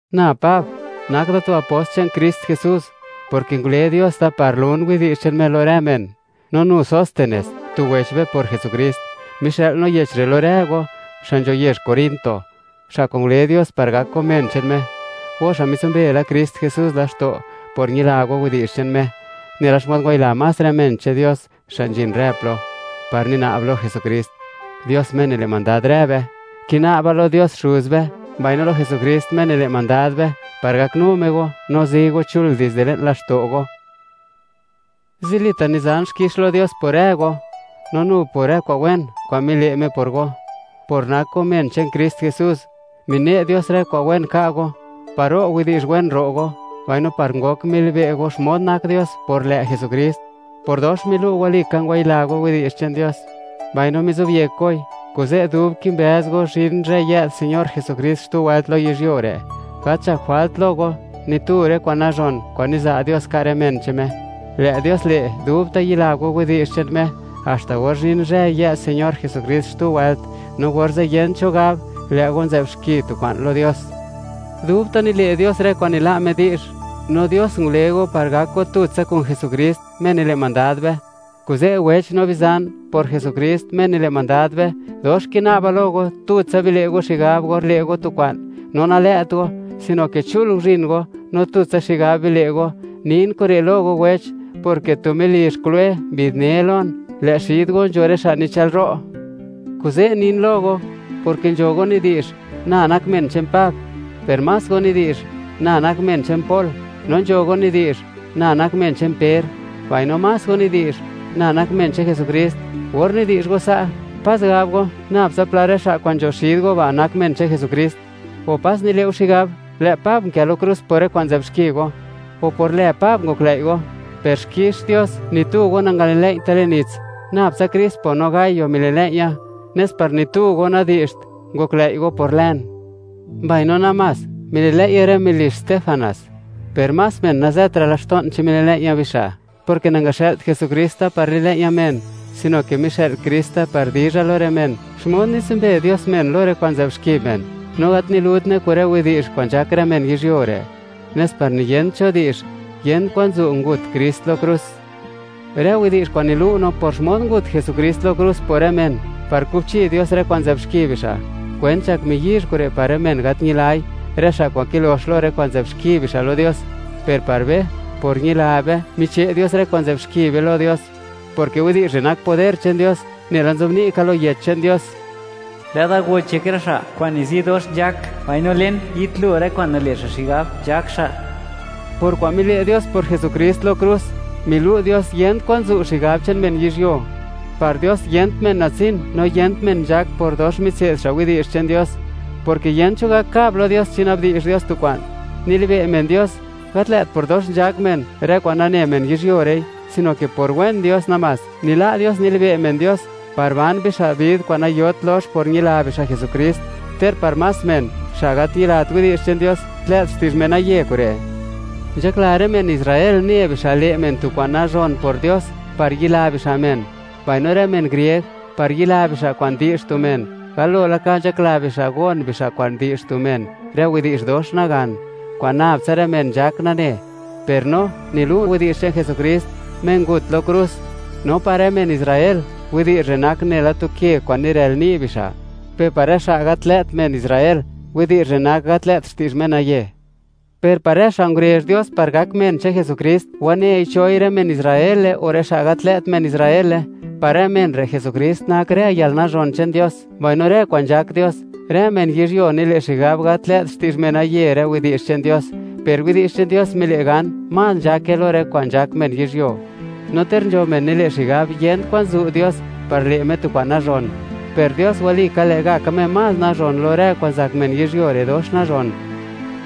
Na Pab, nak da tu apost che'n Krist Jesús, porke ngule Dios da par lun widi'zh che'n Me lo rë men, no nu Sóstenes, tu wech be por Jesukrist; mixë'l no yech re' lo rë go, xa' nzho yezh Corinto, xa' kwa'n ngule Dios, par gak go men che'n Me, go xa' mitsumbe la Krist Jesús laxto' por ñila go widi'zh che'n Me, nela xmod ngwayila más rë men che'n Dios xa' nzhin rë plo, par nina'b bixa' lo Jesukrist, Dios Me nile' mandad rë be. Kina'ba lo Dios Xuz be, mbaino lo Jesukrist Me nile' mandad be, par gaknu Me go, no zi go chul dizde le'n laxto' go. Zilita' nizan xkix lo Dios por rë go, no nu por rë kwa'n wen, kwa'n mile' Me por go, por nak go men che'n Krist Jesús. Mine' Dios rë kwa'n wen ka' go, par ro' widi'zh wen ro' go, mbaino par ngok milibe' go xmod nak Dios, por lë' Jesukrist, por dox milu' walika ngwayila go widi'zh che'n Dios, mbaino mizobyek goi. Kuze', dub kimbëz go, zhin zhë yë'd Señor Jesukrist xtu wëlt lo yizhyuo re', gat nzhakt jwalt lo go, ni tu rë kwa'n nazhon, kwa'n niza' Dios ka' rë men che'n Me. Lë' Dios le', dubta' yila go widi'zh che'n Me, haxta or zhin zhë, yë'd Señor Jesukrist xtu wëlt, no orze' yent cho gab, lë' go nzë'b xki tu kwa'n lo Dios. Dubta' nile' Dios rë kwa'n nila' Me di'zh, no Dios ngule go par gak go tutsa kun Jesukrist, Me nile' mandad be. Kuze', wech no bizan, por Jesukrist, Me nile' mandad be, dox kina'ba lo go, tutsa bile' go xigab or le' go tu kwa'n; no nalë't go, sino ke chul guzhin go, no tutsa xigab bile' go. Nin kure' lo go wech, porke tu melizh Cloé mbi'dne lon, lë' xid go nzho rë xa' nichë'lro'. Kuze' nin lo go, porke nzho go nidi'zh: “Na nak men che'n Pab”, per más go nidi'zh: “Na nak men che'n Pol”, no nzho go nidi'zh: “Na nak men che'n Per”, mbaino más go nidi'zh: “Na nak men che'n Jesukrist.” Or nidi'zh go sa', pas gab go, nab tsa pla rë xa' kwa'n nzho xid go ba' nak men che'n Jesukrist; o, ¿pas nile' go xigab, lë' Pab nkë lo krus por rë kwa'n nzë'b xki go? o, ¿por lë Pab ngoklëi' go? Per xkix Dios, ni tu go nangalilëi'ya le'n nits, nab tsa Crispo no Gayo mililëi'ya, nes par ni tu go nadi'zht, ngoklëi' go por lën. Mbaino namás, mililëi'ya rë melizh Stefanas, per más men nazëtra' laxto'n, chi mililëi'ya bixa', porke nangaxë'lt Jesukrist da par lilëi'ya men, sino ke mixë'l Krist da par dizha lo rë men, xmod nitsumbe Dios men lo rë kwa'n nzë'b xki men, no gat nilutne kun rë widi'zh kwa'n nzhak rë men yizhyuo re', nes par niyent cho di'zh, yent kwan zu' ngut Krist lo krus. Rë widi'zh kwa'n nilu' no por xmod ngut Jesukrist lo krus por rë men, par kubchi Dios rë kwa'n nzë'b xki bixa'; kwent nzhak miyizh kure' par men gat ñilai, rë xa' kwa'n kilox lo rë kwa'n nzë'b xki bixa' lo Dios. Per par be, por ñila be, miche' Dios rë kwa'n nzë'b xki be lo Dios, porke widi'zh re' nak poder che'n Dios. Nela nzobni' ka lo Yech che'n Dios: Lë'da goch yek rë xa' kwa'n nizi dox nzhak, mbaino len, yitlo rë kwa'n nile' xa' xigab nzhak xa'. Por kwa'n mile' Dios por Jesukrist lo krus, milu' Dios yent kwan zu' xigab che'n men yizhyuo. Par Dios, yent men natsin, no yent men nzhak por dox mitse'd xa' widi'zh che'n Dios, porke yent cho gak kab lo Dios chi na'bdi'zh Dios tu kwa'n. Nilibe' men Dios, gat lë't por dox nzhak men, rë kwa'n nane men yizhyuo re'i, sino ke por wen Dios namás, nila' Dios nilibe' men Dios par ban bixa' bid kwa'n nayot lox por ñila bixa' Jesukrist, ter par más men, xa' gat ñilat widi'zh che'n Dios, tlë't xti'zh menaye kure'. Nzhakla rë men Israel ne bixa' le' men tu kwa'n nazhon por Dios, par yila bixa' men; mbaino rë men grieg, par yila bixa' kwa'n di'zh tu men, galo laka nzhakla bixa' gon bixa' kwa'n di'zh tu men rë widi'zh dox nagan kwa'n nab tsa rë men nzhak nane; per no nilu' widi'zh che'n Jesukrist, Me ngut lo krus; no par rë men Israel, widi'zh re' nak nela tu ke kwa'n nirël ni' bixa'; per par rë xa' gat lë't men Israel, widi'zh re' nak gat lë't xti'zh menaye; per par rë xa' ngurezh Dios par gak men che'n Jesukrist, wanei choi, rë men Israele o rë xa' gat lë't men Israele; par rë men re', Jesukrist nak rë yalnazhon che'n Dios, mbaino rë kwa'n nzhak Dios. Rë men yizhyuo nile' xigab, gat lë't xti'zh menaye rë widi'zh che'n Dios, per widi'zh che'n Dios mile' gan, más nzhake lo rë kwa'n nzhak men yizhyuo; no ter nzho men nile' xigab, yent kwan zu' Dios par le' Me tu kwa'n nazhon, per Dios walika lë'gaka Me más nazhon lo rë kwa'n zak men yizhyuo re' dox nazhon.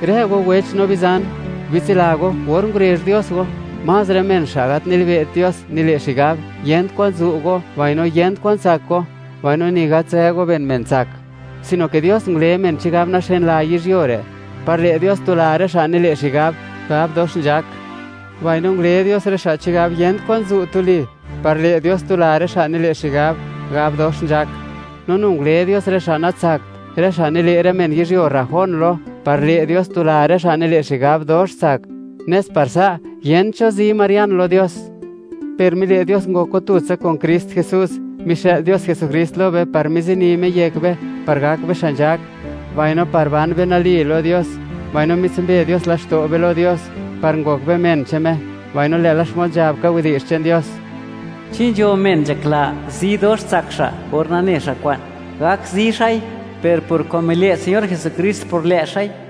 Rë go wech no bizan, bitsila go, or ngurezh Dios go, más rë men xa' gat nilibe't Dios nile' xigab, yent kwan zu' go mbaino yent kwan tsak go, mbaino ni gat nzë go ben men tsak, sino ke Dios ngule men chigab naxeenla yizhyuo re', par le' Dios tula rë xa' nile' xigab, gab dox nzhak; mbaino ngule Dios xa' chigab yent kwan zu' tuli, par le' Dios tula rë xa' nile' xigab, gab dox nzhak. No nu ngule Dios rë xa' natsakt, rë xa' nile' rë men yizhyuo rrajón lo, par le' Dios tula rë xa' nile' xigab, dox tsak, nes par sa', yent cho zi marian lo Dios. Per mile' Dios ngok go tutsa kun Krist Jesús; mixë'l Dios Jesukrist lo be par mizini Me yek be, par gak be xa' nzhak, mbaino par ban be nali lo Dios; mbaino mitsumbe Dios laxto' be lo Dios, par ngok be men che'n Me. Mbaino lë'la xmod nzhab ka widi'zh che'n Dios: Chi nzho men nzhakla, zi dox tsak xa' por nane xa' kwa'n, gak zi xa'i, per por kwa'n mile' Señor Jesukrist por lë' xa'i.